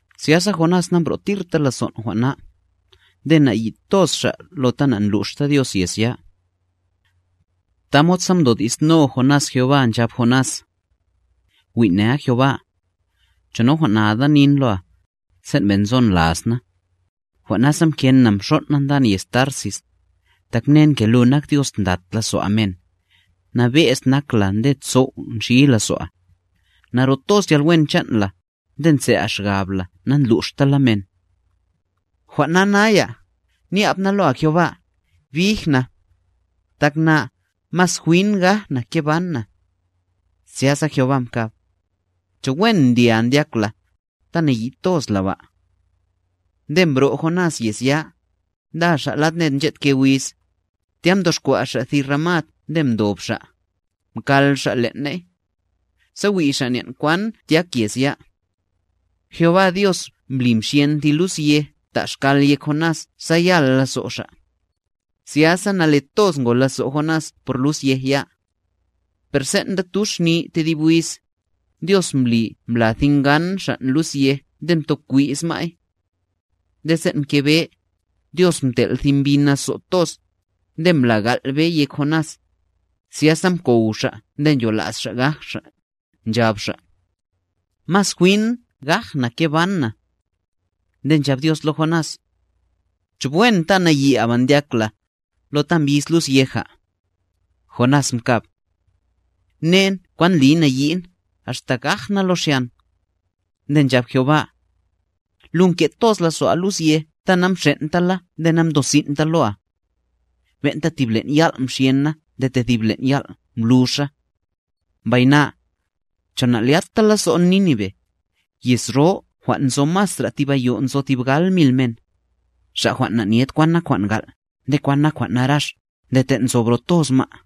Zyasa Jonás nambro'tirta lazon' jwan' na, nde nayi' toz xa' lo ta na'ndluxta Dios yez ya. Tamod sa mdodi'sno Jonás Jehová, nchab Jonás: —Wi' nea, Jehová, ¿cho najwan'nada nin loa, sen' ben' nzon las na? Jwan' nasa mken na mxon' na ndan yez Tarsis, tak mnen ke lu nak Dios ndlat lazo'a men, nabe'z nak la nde sow' nxi lazo'a, naro toz yalwen chan' la, nde ntse'a xgabla nandluxta la men. Jwan' na naya, nyab na loa Jehová, bij na, tak na, mas jwin gaj na ke ban na. Zyasa Jehová mkab: —¿Cho wen ndlya ndyak la, ta nayi' toz la ba? Nde mbro' Jonás yez ya, nda xa' lad ned nched ke wiz, tya mtoxkwa' xa' ti ramad nde mdob xa', mkal xa' len' ney, sa wi' xa' nen' kwan tyak yez ya. Jehová Dios mbli mxyen thi lus yeja ta' xkal yek Jonás sa yal lazo' xa'. Zyasa nale toz ngo lazo' Jonás por lus yej ya. Per sen' nda tuxni tedib wiz, Dios mbli mbla ti ngan xan' lus yej nde mtokwiz ma'y. Nde sen' mke be, Dios mtel' thi mbi nazo' toz, nde mbla gal' be yek Jonás, zyasa mkow xa' nde nchola's xa' gaj xa', nchab xa': —Mas jwin gaj na ke ban na. Nde nchab Dios lo Jonás: —¿Cho wen ta nayi'a ba ndyak la, lo ta mbiz lus yeja? Jonás mkab: —¡Mnen kwan ndliy nayi'n, axta gaj na lo xyan! Nde nchab Jehová: —Lu nke' toz lazo'a lus yej ta namxen'ta la nde namdosin'ta loa. Ben'ta tib len' yal' mxyen na nde tedib len' yal' mbluxa. ¿Mbay na, cho na'lyatta lazo'n Nínive, yez ro jwan' nzo masra thib ayo' nzo tib gal mil men, xa' jwan' na'nyed kwan nak jwan' gal' nde kwan nak jwan' narax nde ten' nzo bro toz ma'?